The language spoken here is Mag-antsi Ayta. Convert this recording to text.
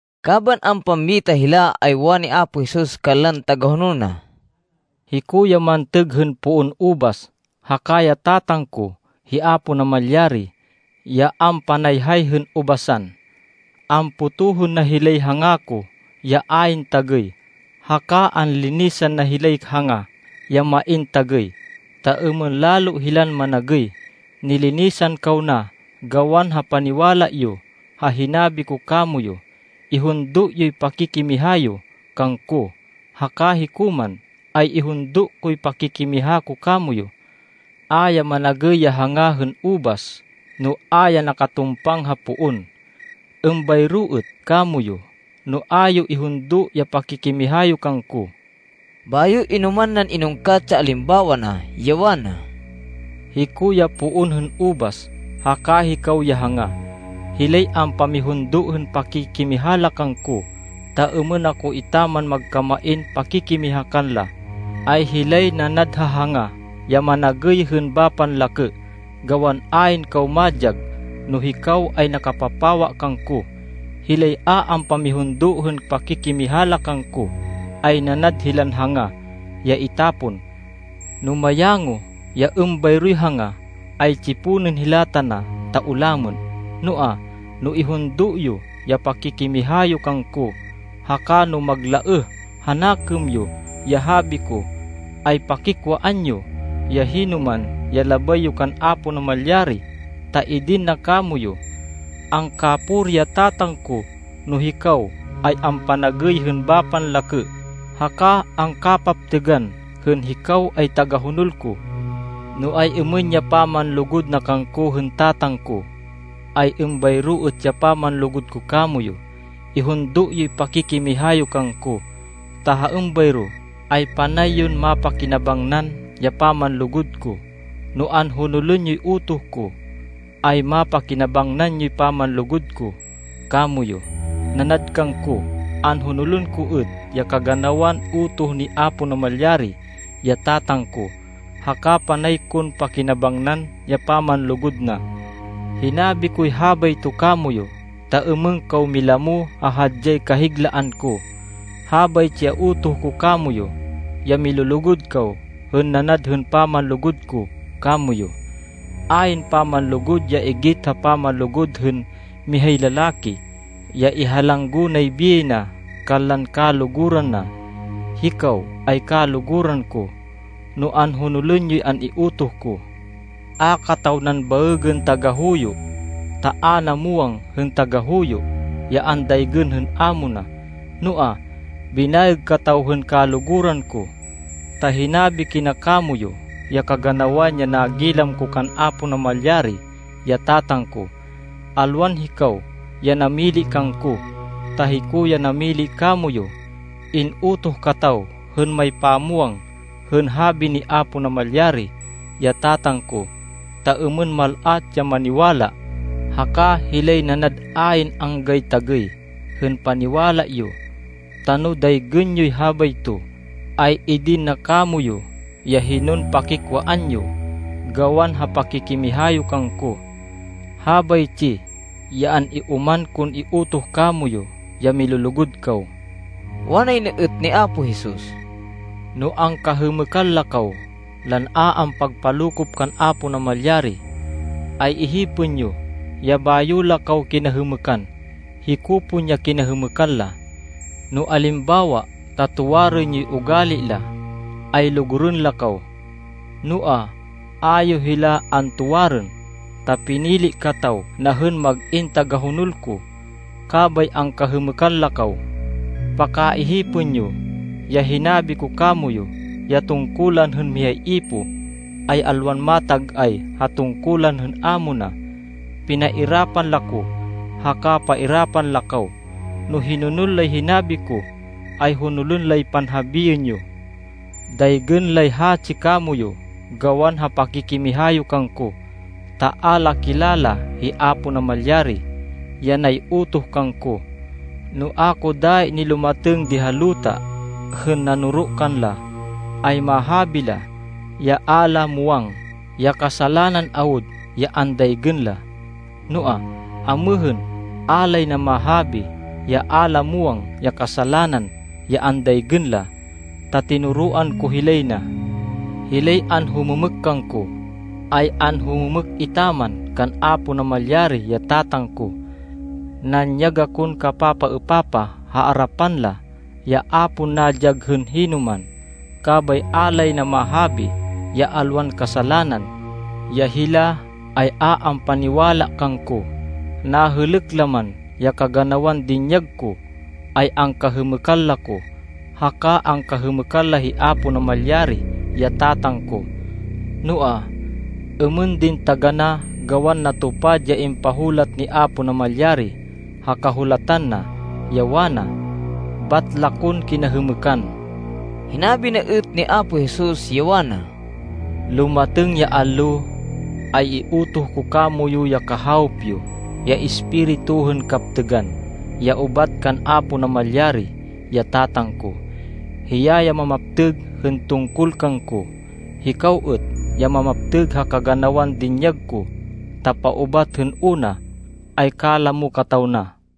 Kaban ampammita hila, ay wani Apo Jesus kanlan tagahonol na, “Hiko ya mantêg hên poon ubas, haka ya Tatang ko, hi Apo Namalyari, ya ampanayhay hên ubasan. Ampotohên na hilay hanga ko ya ayn tagêy, haka anlinisan na hilay hanga ya main tagêy, ta êmên lalo hilan managêy. Nilinisan kaw na gawan ha paniwala yo ha hinabi ko kamoyu. Ihundo yoy pakikimiha yo kangko, haka hiko man, ay ihundo koy pakikimiha ko kamoyu. A ya managêy ya hanga hên ubas, no a ya nakatumpang ha poon. Êmbayro êt kamoyu, no a yo ihundo ya pakikimiha yo kangko.” Bayo inoman nan inungkat ya alimbawa na, ya wana, “Hiko ya poon hên ubas haka hikaw ya hanga. Hilay ampamihundo hên pakikimiha la kangko, ta êmên ako etaman magkamain pakikimiha kanla, ay hilay nanad ha hanga ya managêy hên bapan lakê, gawan ayn kaw madyag, no hikaw ay nakapapawa kangko. Hilay a ampamihundo hên pakikimiha la kangko, ay nanad hilan hanga ya itapon. No mayango ya êmbayroy hanga, ay tsiponên hila tana, ta ulamên. Noa, no ihundo yo ya pakikimiha yo kangko, haka no maglaêh ha nakêm yo ya habi ko, ay pakikwaan yo ya hinoman ya labay yo kan Apo Namalyari, ta idin na kamoyu. Angkapuri ya Tatang ko no hikaw ay ampanagêy hên bapan lakê, haka angkapaptêgan hên hikaw ay tagahonol ko. No ay-êmên ya pamanlugud na kangko hên Tatang ko, ay êmbayro êt ya pamanlugud ko kamoyu. Ihundo yoy pakikimiha yo kangko, ta ha êmbayro ay panay yon mapakinabangnan ya pamanlugud ko. No anhonolên yoy utoh ko, ay mapakinabangnan yoy pamanlugud ko kamoyu. Nanad kangko, anhonolên ko êt ya kaganawan utoh ni Apo Namalyari, ya Tatang ko, haka panay kon pakinabangnan ya pamanlugud na.” “Hinabi koy habayto kamoyu, ta êmên kaw milamo ha hadyay kahiglaan ko. Habaytsi ya utoh ko kamoyu ya milulugud kaw hên nanad hên pamanlugud ko kamoyu. Ayn pamanlugud ya igit ha pamanlugud hên mihay lalaki, ya ihalanggo nay biyay na kanlan kaluguran na. Hikaw ay kaluguran ko, no anhonolên yoy an-iutoh ko. A kataw nan baêgên tagahuyo, ta a na muwang hên tagahuyo, ya andaygên hên amo na. Noa, binaêg kataw hên kaluguran ko, ta hinabi kina kamoyu ya kaganawan ya nagilam ko kan Apo Namalyari, ya Tatang ko. Alwan hikaw ya namili kangko, ta hiko ya namili kamoyu. In-utoh kataw hên maypamwang hên habi ni Apo Namalyari, ya Tatang ko, ta êmên mal-at ya maniwala, haka hilay nanad ayn anggay tagêy hên paniwala yo. Ta no daygên yoy habayto, ay idin na kamoyu ya hinon pakikwaan yo, gawan ha pakikimiha yo kangko. Habaytsi ya an-ioman kon iutoh kamoyu, ya milulugud kaw.” Wanay na êt ni Apo Jesus, “No angkahêmêkan la kaw lan a ampagpalokop kan Apo Namalyari, ay ihipên yo ya bayo la kaw kinahêmêkan, hiko pon ya kinahêmêkan la. No alimbawa ta tuwarên yoy ugali la, ay lugurên la kaw. Noa, a yo hila antuwarên, ta pinili kataw na hên mag-in tagahonol ko. Kabay angkahêmêkan la kaw. Paka-ihipên yo ya hinabi ko kamoyu, ya tungkulan hên mihay ipoh ay alwan matag-ay ha tungkulan hên amo na. Pinairapan la ko, haka pairapan la kaw. No hinonol lay hinabi ko, ay honolên lay panhabiên yo. Daygên lay hatsi kamoyu gawan ha pakikimiha yo kangko ta a la kilala hi Apo Namalyari, ya nay-utoh kangko. No a ko dayi nilumatêng di ha luta hên nanoro kanla, ay mahabi la ya a la muwang ya kasalanan awud ya andaygên la. Noa, amêhên, a lay na mahabi ya a la muwang ya kasalanan ya andaygên la, ta tinoroan ko hilay na. Hilay anhumêmêk kangko, ay anhumêmêk etaman kan Apo Namalyari, ya Tatang ko. Nanyag akon kapapaêpapah ha arapan la, ya a pon nadyag hên hinoman, kabay a lay na mahabi ya alwan kasalanan, ya hila ay a ampaniwala kangko. Nahêlêk la man ya kaganawan dinyag ko, ay angkahêmêkan la ko, haka angkahêmêkan la hi Apo Namalyari, ya Tatang ko. Noa, êmên din taganá, gawan natupad ya impahulat ni Apo Namalyari ha Kahulatan na, ya wana, ‘Bat la kon kinahêmêkan.’” Hinabi na êt ni Apo Jesus, ya wana, “Lumatêng ya allo, ay iutoh ko kamoyu ya Kahawop yo, ya Espiritu hên kaptêgan, ya ubat kan Apo Namalyari, ya Tatang ko. Hiya ya mamaptêg hên tungkol kangko. Hikaw êt ya mamaptêg ha kaganawan dinyag ko, ta paubat hên una, ay kalamo kataw na.”